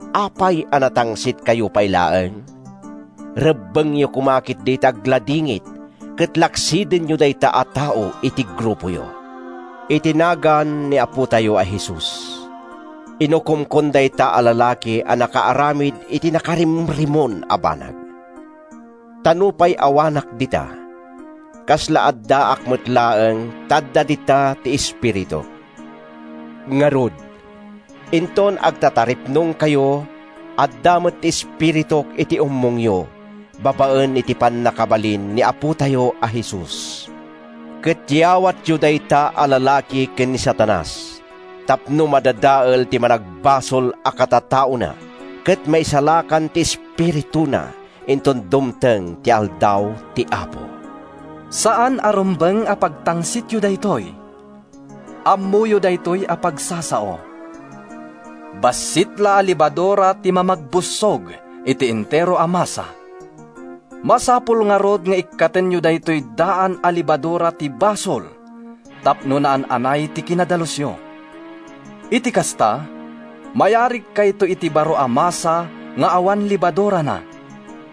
Apay a natangsitkayo pay laeng? Rebbengyo koma ketdi ti agladingit ket laksidenyo dayta a tao iti grupoyo. Iti nagan ni Apotayo a Jesus, inukomkon dayta a lalaki a nakaaramid iti nakarimrimon a banag. Ta nupay awanak dita, kasla addaak met laeng ta adda dita ti espirituk. Ngarud, inton agtataripnongkayo, adda met ti espirituk iti ummongyo babaen iti pannakabalin ni Apotayo a Jesus, ket yawatyo dayta a lalaki ken ni Satanas tapno madadael ti managbasol a katataona ket maisalakan ti espirituna inton dumteng ti Aldaw ti Apo. Saan a rumbeng a pagtangsityo daytoy. Ammoyo daytoy a pagsasao, “Bassit la a lebadura ti mamagbussog iti entero a masa.” Masapul ngarud nga ikkatenyo daytoy daan a lebadura ti basol tapno naan-anay ti kinadalusyo. Iti kasta, mayarigkayto iti baro a masa nga awan lebadurana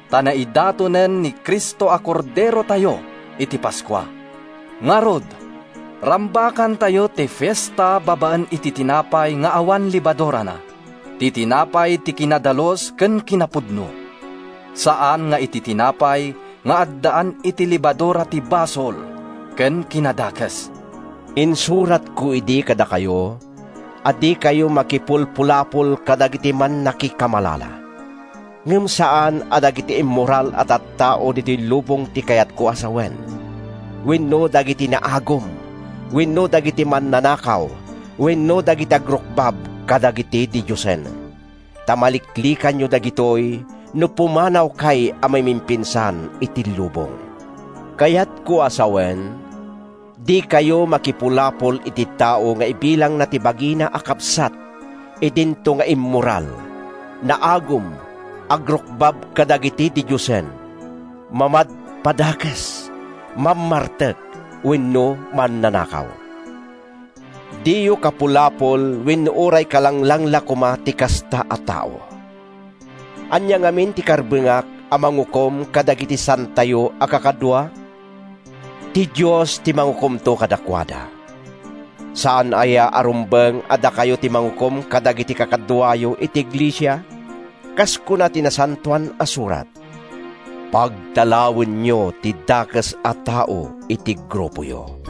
ta naidatonen ni Cristo a korderotayo iti Paskua. Ngarud, rambakantayo ti fiesta babaen iti tinapay nga awan lebadurana, ti tinapay ti kinadalus ken kinapudno, saan nga iti tinapay nga addaan iti lebadura ti basol ken kinadakes. Insuratko idi kadakayo a dikayo makipulpulapol kadagiti mannakikamalala. Ngem saan a dagiti immoral a tattao ditoy lubong ti kayatko a sawen, wenno dagiti naagum wenno dagiti mannanakaw wenno dagiti agrukbab kadagiti didiosen, ta maliklikanyo dagitoy no pumanawkay a mamimpinsan iti lubong. Kayatko a sawen, dikayo makipulapol iti tao nga ibilangna ti bagina a kabsat idinto nga immoral, naagum, agrukbab kadagiti didiosen, mamadpadakes, mammartek wenno mannanakaw. Diyo kapulapol wenno uray kalanglang la koma ti kasta a tao. Ania ngamin ti karbengak a mangukom kadagiti saantayo a kakadua? Ti Dios ti mangukomto kadakuada. Saan aya a rumbeng a dakayo ti mangukom kadagiti kakaduayo iti iglesia? Kas kuna ti Nasantoan a Surat, “Pagtalawenyo ti dakes a tao iti grupoyo.”